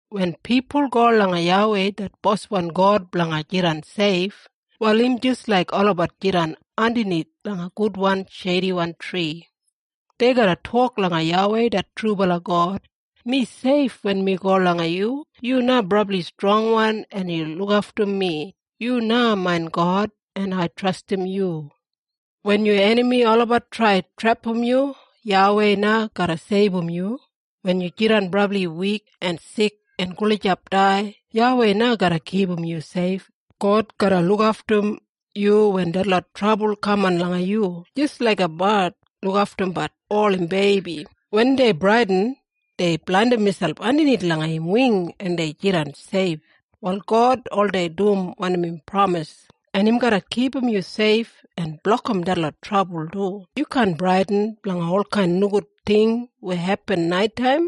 Wen pipul go langa YAWEI det Boswan God blanga jidan seifwan, wal im jis laik olabat jidan andanith langa gudwan sheidiwan tri. Dei garra tok langa YAWEI det trubala God, “Mi seif wen mi go langa yu. Yu na brabli strongwan en yu lukaftum mi. Yu na main God, en ai trastim yu.” Wen yu enami olabat trai trepam yu, YAWEI na garra seibum yu. Wen yu jidan brabli wikwan o sikwan en gulijap dai, YAWEI na garra kipum yu seifwan. God garra lukaftum yu wen detlot trabul kaman langa yu, jis laiga bard lukaftumbat ol im beibi. Wen dei bradin dei blandim miselp andanith langa im wing en dei jidan seif. Wal God oldei dum wanim im pramisim, en im garra kipum yu seif en blokim detlot trabul du. Yu kaan bradin blanga olkain nogud ting weya hepin naitaim.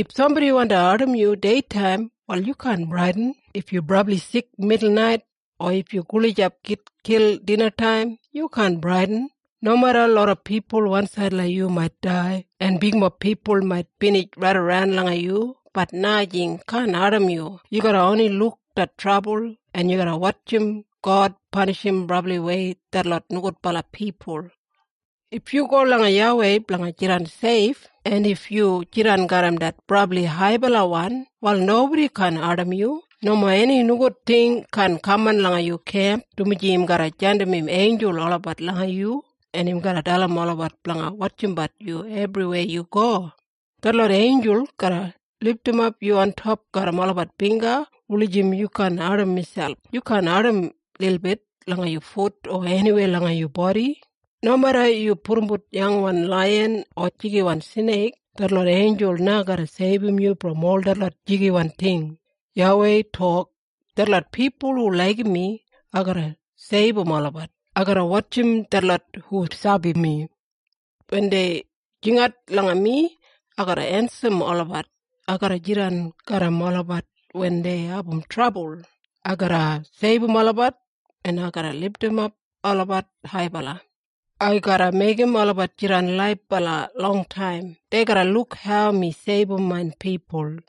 If sambodi wandi ardim yu deitaim wal yu kaan bradin. If yu brabli sik midulnait, o if yu gulijap gitkil dinataim, yu kaan bradin. Nomeda loda pipul wansaid langa yu mait dai, en bigmob pipul mait binij raidaran langa yu, bat nomo enijing kaan ardim yu. Yu garra oni luk det trabul, en yu garra wotjim God panishim brabliwei detlot nogudbala pipul. If yu go langa YAWEI blanga jidan seif, en if yu jidan garram det Brabli Haibalawan, wal nobodi kaan ardim yu. Nomo eni nogud ting kaan kaman langa yu kemp, dumaji im garra jandim im einjul olabat langa yu, en im garra dalim olabat blanga wotjimbat yu ebriweya yu go. Detlot einjul garra lidimap yu ontop garram olabat bingga wulijim yu kaan ardim miselp. Yu kaan ardim lilbit langa yu fut o eniweya langa yu bodi. Nomeda yu pudumbut yangwan laiyan o jigiwan sneik, detlot einjul na garra seibum yu brom ol detlot jigiwan ting. YAWEI tok, “Detlot pipul hu laigim mi, ai garra seibum olabat. Ai garra wotjim detlot hu sabi mi. Wen dei jingat langa mi, ai garra ensim olabat. Ai garra jidan garram olabat wen dei abum trabul. Ai garra seibum olabat, en ai garra lidimap olabat haibala. Ai garra meigim olabat jidan laibala longtaim. Dei garra luk hau mi seibum main pipul.”